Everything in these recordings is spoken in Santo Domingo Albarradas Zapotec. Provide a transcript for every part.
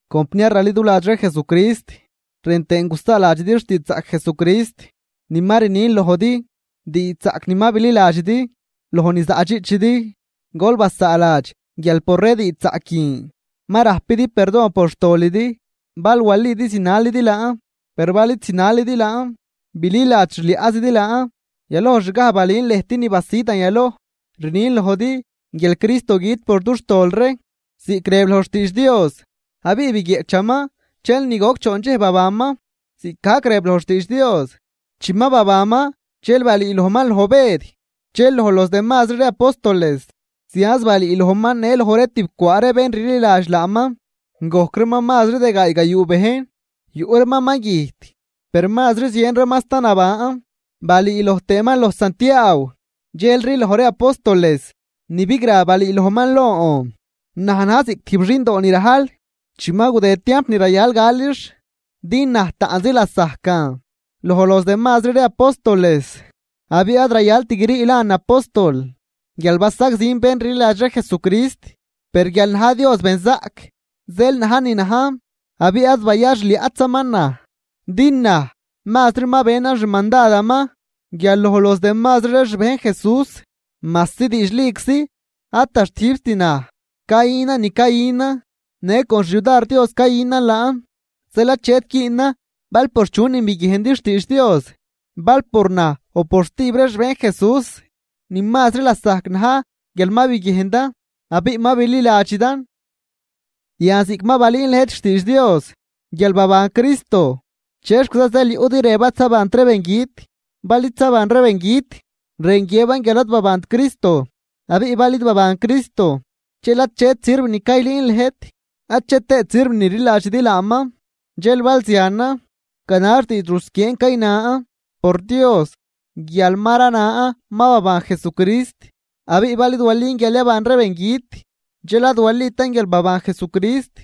Compniar raliduladx ree Jesucrist, rën tëën gusaaladxidi xtiidxzaꞌc Jesucrist ni ma rnin lojd, diidxzaꞌc ni ma bililadxidi loj ni zaꞌdxiꞌchidi. Gol basaaladx guial por ree diidxzaꞌc guin ma rajpidi perdon por xtolidi bal walidi zinalidi laan, per bal id zinalidi laan bililadx xliaꞌzidi laan. Yalojxgaj balün lëjt ni basidan yaloj. Rnin lojdi guial Cristo güt por dux tol ree ziꞌc rëb loj xtiidx Dios. Abiꞌ biguieꞌchaman dxel ni goc choon dxej babanman ziꞌcgajc rëb loj xtiidx Dios. Chi ma babanman, dxel balüülojman loj Bëd dxel loj los demazri ree apóstoles. Zianz balüülojman në loj ree tijb cwaa ree bén rliladx laaman, gojc reeman mazri de gaay gayuu bejn. Yuꞌ reeman ma güjt, per mazri zien reeman sta naban. Balüü loj tëëman loj Santiaaw dxelri loj ree apóstoles. Ni bigra balüülojman lon, naj najn ziꞌc tijb xindo ni rajl chi ma gudëd tiamp ni rayal galix. Din naj taꞌnzi lasajcan loj los demazri ree apóstoles, abiꞌ ad rayalt guirii lan apóstol guial basagzin bén rliladx ree Jesucrist. Per guial na̱j Dios benzaꞌc zeel najn ni najn, abiꞌ ad bayaxliaꞌtzaman naj din naj mazri ma benan xmandadaman guial loj los demazri ree xbejn Jesús, majsi diidxliczi ad da xtijbt naj cayünan ni cayünan, në con xyudar Dios cayünan laan. Zeel achet güünan bal por chunin biguiejndi xtiidx Dios bal por naj o por stijb ree xbejn Jesús, ni mazri lasajc na̱j guial ma biguiejndan abiꞌ ma bililadxidan. Yan ziꞌc ma balüün lëjt xtiidx Dios guial baban Cristo, ¿chexquiza zeel yuꞌdi rëb ad zabant ree bengüt? Bal id zaban ree bengüt, rën guiëban guial ad babant Cristo. Abiꞌ bal id baban Cristo dxel achet sirv ni caylüün lëjt, ache tëët sirv ni rliladxidi laaman. Dxel bal zianan, ganax diidx rusquieen caynan por Dios guial ma ranan ma baban Jesucrist. Abiꞌ bal id walin guial yaban ree bengüt, dxel ad walitan guial baban Jesucrist.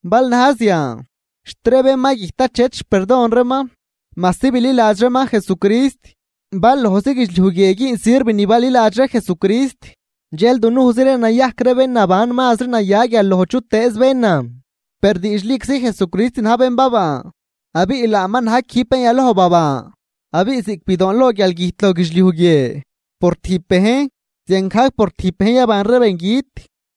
Bal na̱j zian, xt ree bén ma güjt achet xperdon reeman majsi bililadx reeman Jesucrist. Bal lojzi guidxliuj guie güün sirv ni baliladx ree Jesucrist dxel dunujzi ree nayajc ree bén naban mazri naya guial loj chutëëz bénan. Per diidxliczi Jesucrist na̱j bén baban, abiꞌ laaman na̱j quijb bén yaloj baban. Abiꞌ ziꞌc bidoonloj guialgüjt loj guidxliuj guie por tijb bejn, ziangajc por tijb bejn yaban ree bengüt.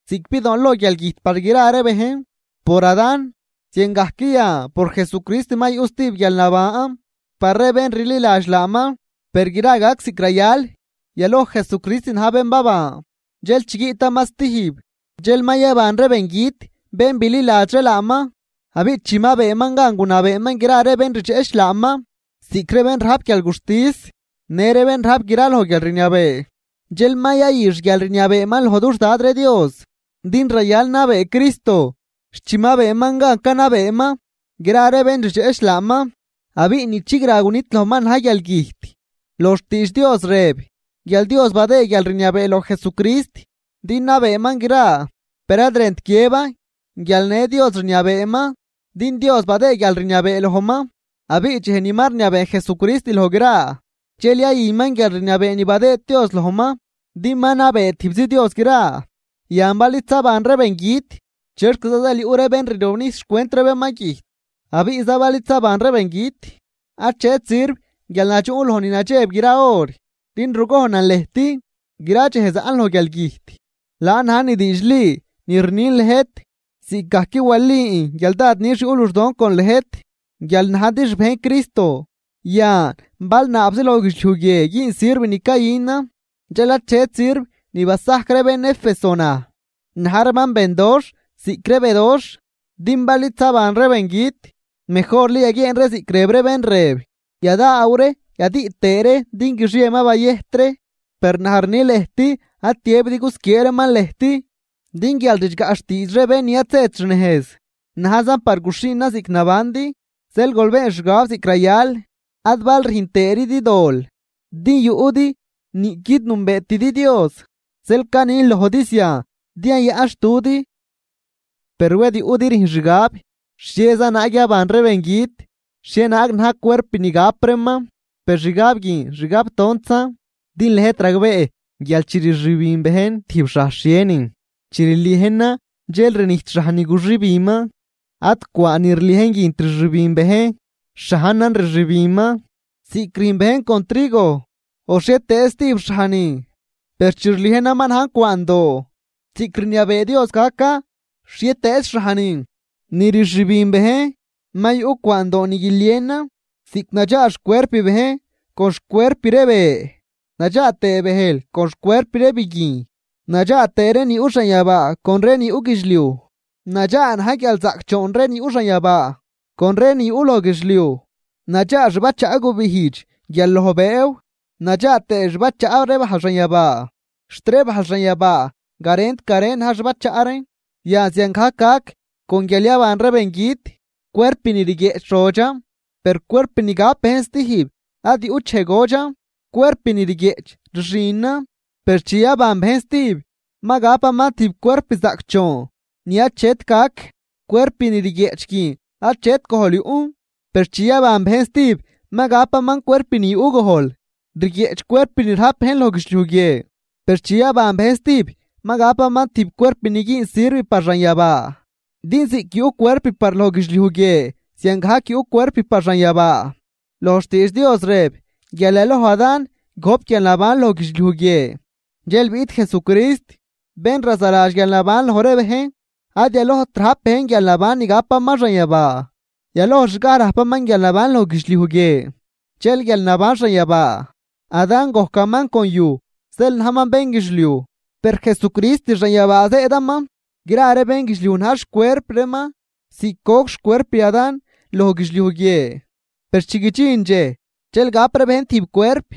Ziꞌc bidoonloj guialgüjt par gra ree bejn por Adán, ziangajc yan por Jesucrist ma yuꞌ stijb guialnaban par ree bén rliladx laaman. Per gra gac ziꞌc rayal: Yaloj Jesucrist na̱j bén baban, dxel chi guiꞌtaman stijb dxel ma yaban ree bengüt bén bililadx ree laaman. Abiꞌ chi ma beenman gan gunabeeman gra ree bén rdxeꞌch laaman, ziꞌc ree bén rajp guialguxtis në ree bén rajp graloj guial rniabee, dxel ma yayü xguialrniabeeman loj dux Dad ree Dios. Din rayal nabee Cristo xt chi ma beeman gan canabeeman gra ree bén rdxeꞌch laaman. Abiꞌ ni chigra gunidlojman na̱j guialgüjt. Loj xtiidx Dios rëb guial Dios badëë guialrniabee loj Jesucrist din nabeeman gra, per ad rënt guiëban guial në Dios rniabeeman din Dios badëëd guialrniabee lojman. Abiꞌ dxej ni ma rniabee Jesucrist loj gra dxel yayüman guialrniabee ni badëëd Dios lojman din ma nabee tijbzi Dios gra. Yan bal id zaban ree bengüt, ¿chexquiza zeel yuꞌ ree bén rirobnijs xcwent ree bén ma güjt, abiꞌza bal id zaban ree bengüt? Achet sirv guial nadxuꞌn loj ni nadxeb gra hor. Din rugojnan lëjt, gra dxej zaꞌn loj guialgüjt, laan na̱j ni diidxli ni rnin lëjt ziꞌcgajc walin guial dad nix yuꞌ luxdon con lëjt guial najdi xbejn Cristo. Yan bal naabzi loj guidxliuj guie güün sirv ni cayünan dxel achet sirv ni basajc ree bén Éfeso naj, na̱j reeman bendoxh ziꞌc ree bedoxh. Din bal id zaban ree bengüt mejorli yaguieen ree ziꞌc rëb ree bén rëb: “Yadaaw ree yadüꞌ tëë ree din guixie ma bayëjt ree.” Per naj rni lëjt ad tiëbidi gusquiee reeman lëjt. Din guial ridxgaꞌ xtiidx ree bén ni ad zët xnejz, najzan par guxhiinan ziꞌc nabandi. Zeel gol been xgab ziꞌc rayal ad bal rüjn tëëridi dol din yuꞌdi niꞌquid nünbeetidi Dios, zeel canin lojdi zian din yayaꞌnxtudi. Per wed yuꞌdi rüjn xgab: “¿Xhieza naag yaban ree bengüt? ¿Xhienaag na̱j cuerp ni gap reeman?” Per xgab guin xgab tontzan. Din lëjt ragbee guial chi rxübin bejn tijb xhaj xhienin, chi rliejnan dxel rnijt xhaj ni guxübinman. Ad cwaan ni rliejn guint rxübin bejn, xhajnan rxübinman, ziꞌc rüjn bejn con trigo o xhietëëz stijb xhaj nin. Per chi rliejnan ma najn cwaandoo ziꞌc rniabee Dios gacan, xhietëëz xhaj nin ni rxübin bejn ma yuꞌ cwaando ni guilienan. Ziꞌc nadxaa xcuerp bejn con xcuerp ree be, nadxaa tëë bëjl con xcuerp ree biguijn. Nadxaa tëë ree ni yuꞌ xanyabaa con ree ni yuꞌ guidxliuj, nadxaa na̱j guialzaꞌcdxoon ree ni yuꞌ xanyabaa con ree ni yuꞌ loj guidxliuj. Nadxaa xbachaꞌ gubijdx guial loj bëëw nadxaa tëë xbachaꞌ ree bajl xanyabaa, xt ree bajl xanyabaa garent garen na̱j xbachaꞌ reen. Yan ziangajc gac con guial yaban ree bengüt. Cuerp ni rguieꞌch rodxan, per cuerp ni gap bejn stijb ad yuꞌt dxej godxan. Cuerp ni rguieꞌch rxinan, per chi yaban bejn stijb ma gapaman tijb cuerp zaꞌcdxoon ni achet gac. Cuerp ni rguieꞌch guin achet gojl yuꞌn, per chi yaban bejn stijb ma gapaman cuerp ni yuꞌ gojl. Rguieꞌch cuerp ni rajp bejn loj guidxliuj guie, per chi yaban bejn stijb ma gapaman tijb cuerp ni güün sirv par xanyabaa. Din ziꞌc yuꞌ cuerp par loj guidxliuj guie ziangajc yuꞌ cuerp par xanyabaa. Loj xtiidx Dios rëb guial yaloj Adán gojp guialnaban loj guidxliuj guie. Dxel biꞌt Jesucrist, bén razaladx guialnaban loj ree bejn. Ad yalojt rajp bejn guialnaban ni gapaman xanyabaa, yalojxgaj rajpaman guialnaban loj guidxliuj guie dxel guialnaban xanyabaa. Adán gojcaman con yuj zeel najman bénguidxliuj, per Jesucrist xanyabaa zëëdaman. Gra ree bénguidxliuj na̱j xcuerp reeman ziꞌc goc xcuerp Adán loj guidxliuj guie, per chi guidxin dxej dxel gap ree bejn tijb cuerp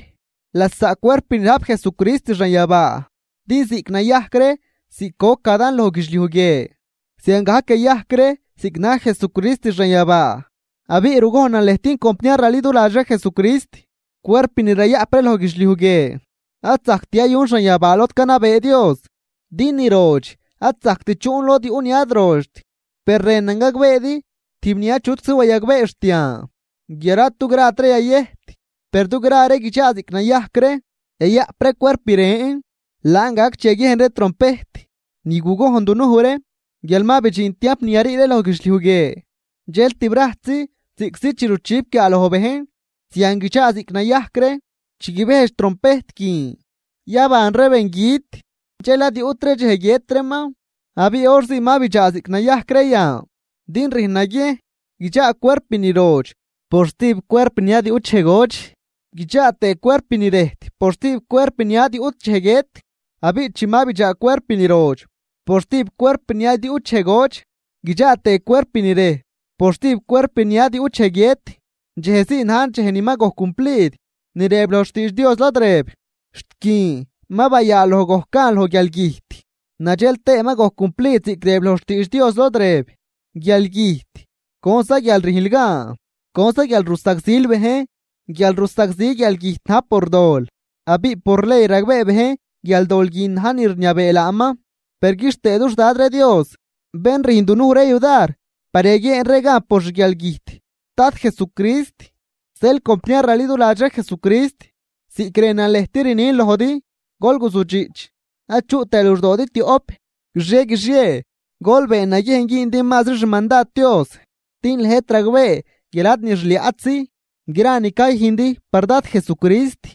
lasaꞌ cuerp ni rajp Jesucrist xanyabaa. Din ziꞌc nayajc ree ziꞌc goc Adán loj guidxliuj guie, ziangajc yayajc ree ziꞌc na̱j Jesucrist xanyabaa. Abiꞌ rugojnan lëjt compniar raliduladx ree Jesucrist, cuerp ni rayaꞌp ree loj guidxliuj guie ad zajct yayun xanyabaa lod canabee Dios. Din ni rodx ad zajct chuꞌn lod yuꞌ ni ad rodxt. Per rënan gagbeedi tijb ni achutczi wayagbee xt yan guial ad dugrat ree yayëjt, per dugra ree guidxaa ziꞌc nayajc ree, yayaꞌp ree cuerp ren. Laan gac chi yaguiejn ree trompejt ni gugojn dunuj ree guial ma bidxin tiamp ni yarii ree loj guidxliuj guie, dxel tibrajtzi ziꞌctzi chi ruchip guiaaloj bejn zian guidxaa ziꞌc nayajc ree. Chi guibejdx trompejt guin yaban ree bengüt dxel ad yuꞌtri dxej guiët reeman abiꞌ hor zii ma bidxaa ziꞌc nayajc ree yan. Din rüjn naguiejn guidxaa cuerp ni rodx por stijb cuerp ni ad yuꞌt dxej godx guidxaa tëë cuerp ni rëjt por stijb cuerp ni ad yuꞌt dxej guiët. Abiꞌ chi ma bidxaa cuerp ni rodx por stijb cuerp ni ad yuꞌt dxej godx guidxaa tëë cuerp ni rëjt por stijb cuerp ni ad yuꞌt dxej guiët, dxejzii na̱j dxej ni ma gojc cumplid ni rëb loj xtiidx Dios lod rëb: “Xt guin ma bayaaloj gojc gan loj guialgüjt.” Nadxel tëë ma gojc cumplid ziꞌc rëb loj xtiidx Dios lod rëb: “Guialgüjt, ¿conza guial rüjnl gan? ¿Conza guial rusagzil bejn?” Guialrusagzi guialgüjt na̱j por dol, abiꞌ por ley ragbee bejn guial dol guin na̱j ni rniabee laaman. Per quixtëe dux Dad ree Dios, bén rüjn dunuj ree yudar par yaguieen ree gan por xguialgüjt Dad Jesucrist. Zeel compniar raliduladx ree Jesucrist ziꞌc rënan lëjt rnin lojdi, gol guzudxiꞌch ad chuꞌ tëë luxdoodi tioꞌp. Guixie guixie gol been naguiejn güündi mazri xmandad Dios, din lëjt ragbee guial ad ni xliaꞌtzi gra ni cayüjndi par Dad Jesucrist.